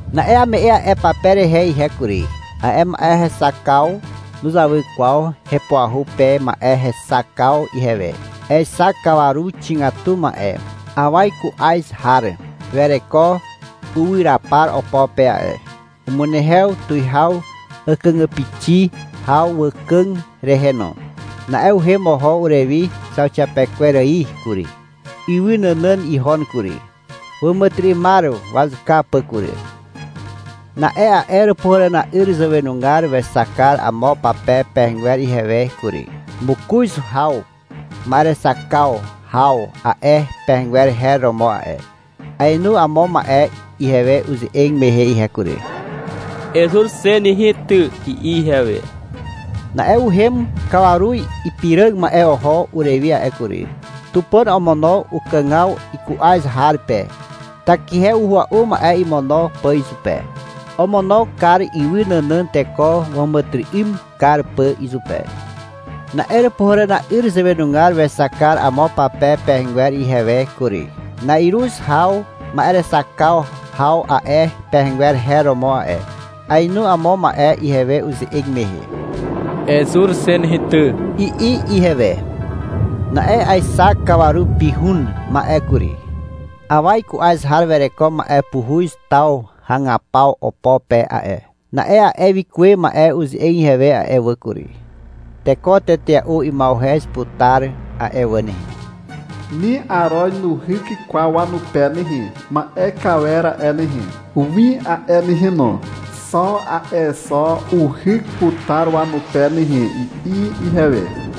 Na'e ame'e a'e pape rehe ihe kury. A'e ma'e hexakaw nuzawy kwaw hepuahu pe ma'e hexakaw ihewe. Aexak kawaru xigatu ma'e. Awa iku'az har wereko uwyrapar opo pe a'e. Umunehew tuwihaw àkàgàpixi haw wàkàg rehe no. Na'e uhem oho urewi zauxiapekwer ài kury. Ywy nànàn ihon kury, wàmàtyry'ymar wazuka pà kury. Na'e a'e Àràpuhàràna'yr zàwenugar wexak kar amo pape pehegwer ihewe kury. Mokoz haw ma'erexak kar haw a'e pehegwer her romo a'e. Aenu amo ma'e ihewe uze'eg mehe ihe kury. — Ezur xe nehe ty, i'i ihewe. Na'e uhem kawaru ipiràg ma'e oho urewi a'e kury. Tupàn omono ukàgaw iku'az har pe, takihe uhua'u ma'e imono pà izupe. Omono kar ywy nànàn, teko wàmàtyry'ym kar pà izupe. Na'e Àràpuhàràna'yr zàwenugar wexak kar amo pape pehegwer ihewe kury. Na'iruz haw ma'erexak kar haw a'e pehegwer her romo a'e. Aenu amo ma'e ihewe uze'eg mehe. — Ezur xe nehe ty, i'i ihewe. Na'e aexak kawaru ipihun ma'e kury. Awa iku'az har wereko ma'e puhuz taw hagapaw opo pe a'e. Na'e a'e wikuwe ma'e uze'eg ihewe a'e wà kury. — Teko tetea'u ima'uhez putar a'e wà nehe. Ni aroz nuhyk kwaw wanupe nehe. Ma'e kawer a'e nehe, win a'e nehe no, xo a'e zo uhyk putar wanupe nehe, i'i ihewe.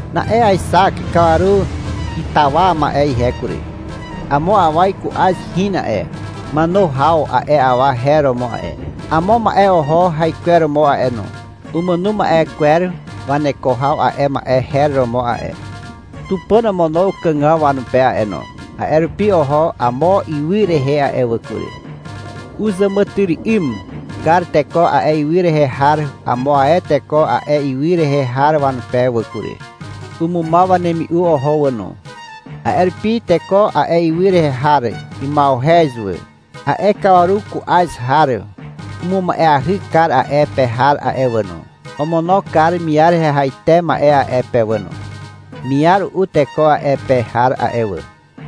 Na'e aexak kawaru itawa ma'e ihe kury. Amo awa iku'az hin a'e. Màno haw a'e awa her romo a'e. Amo ma'e oho haikweromo a'e no. Umàno ma'e kwer waneko haw a'e ma'e her romo a'e. Tupàn omono ukàgaw wanupe a'e no. A'e rupi oho amo ywy rehe a'e wà kury. Uzàmàtyry'ym kar teko a'e ywy rehe har amo ae teko a'e ywy rehe har wanupe wà kury. Umumaw wanemi'u oho wà no. A'e rupi teko a'e ywy rehe har ima'uhez wà. A'e kawaru ku'az har umuma'eahy kar a'e pe har a'e wà no. Omono kar miar hehaite ma'e a'e pe wà no. Miar u'u teko a'e pe har a'e wà.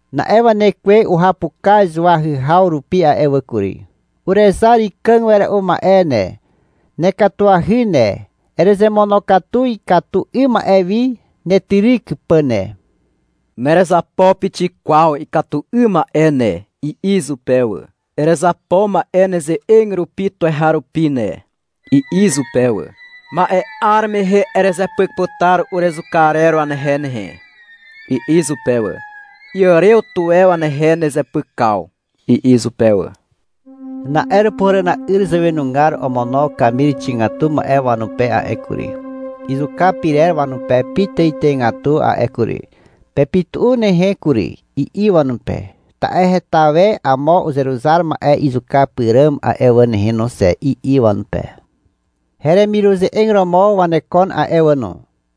Na'e wanekwe uhapukaz wahyhaw rupi a'e wà kury. — Urezar ikàg wera'u ma'e ne, nekatuahy ne, erezemonokatu ikatu 'ym ma'e wi netyryk pà ne. Nerezapo pixik kwaw ikatu 'ym ma'e ne, i'i izupe wà. — Erezapo ma'e neze'eg rupi tuweharupi ne, i'i izupe wà. — Ma'e 'ar mehe erezepyk putar urezuka arer wanehe nehe, i'i izupe wà. Iàrew tuwe wanehe nezepykaw, i'i izupe wà. Na'e Àràpuhàràna'yr zàwenugar omono kamir xigatu ma'e wanupe a'e kury, izuka pyrer wanupe pitàitàigatu a'e kury. — Pepytu'u nehe kury, i'i wanupe. — Ta'e heta we amo uzeruzar ma'e izuka pyràm a'e wà nehe no xe, i'i wanupe. — Heremiruze'eg romo wanekon a'e wà no,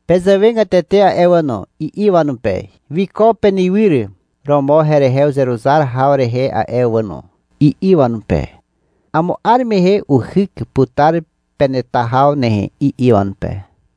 pezàwegatete a'e wà no, i'i wanupe. — Wiko penywyr romo herehe uzeruzar haw rehe a'e wà no, i'i wanupe. — Amo 'ar mehe uhyk putar peneta haw nehe, i'i wanupe.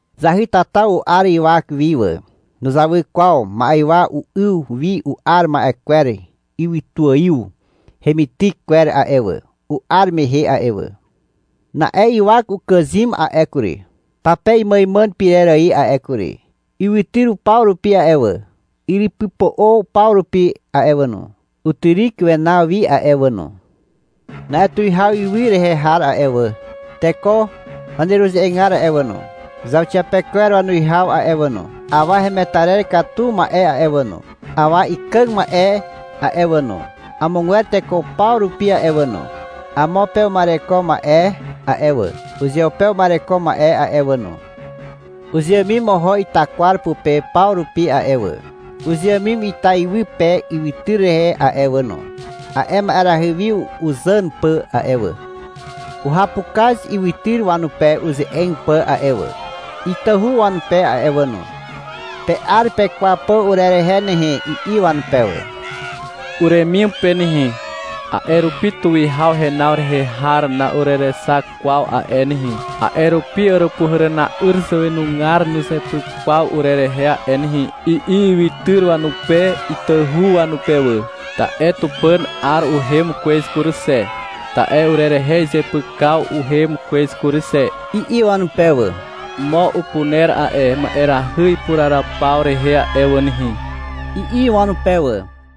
Zahytata u'ar ywak wi wà. Nuzawy kwaw ma'ywa u'yw wi u'ar ma'e kwer ywytuàiw hemityk kwer a'e wà, u'ar mehe a'e wà. Na'e ywak ukàzym a'e kury, pape imàimàn pyrer ài a'e kury. Ywytyr paw rupi a'e wà, yrypypo'o paw rupi a'e wà no, utyryk wenaw wi a'e wà no. Na'e tuwihaw ywy rehe har a'e wà, teko waneruze'egar a'e wà no, zauxiapekwer wanuwihaw a'e wà no, awa hemetarer katu ma'e a'e wà no, awa ikàg ma'e a'e wà no, amogwer teko paw rupi a'e wà no, amo pe uma'ereko ma'e a'e wà, uzeupe uma'ereko ma'e a'e wà no, uzeàmim oho ita kwar pupe paw rupi a'e wà, uzeàmim ita iwy pe ywytyr rehe a'e wà no, a'e ma'erahy wi uzàn pà a'e wà. Uhapukaz ywytyr wanupe uze'eg pà a'e wà, itahu wanupe a'e wà no. — Pe'ar pekwaw pà urerehe nehe, i'i wanupe wà. — Uremim pe nehe, a'e rupi tuwihaw henaw rehe har na'urerexak kwaw a'e nehe, a'e rupi Àràpuhàràna'yr zàwenugar nuzepyk kwaw urerehe a'e nehe, i'i ywytyr wanupe itahu wanupe wà. — Ta'e Tupàn 'ar uhem kwez kury xe, ta'e urerehe izepykaw uhem kwez kury xe, i'i wanupe wà. — Mo upuner a'e ma'erahy ipuraraw paw rehe a'e wà nehe, i'i wanupe wà.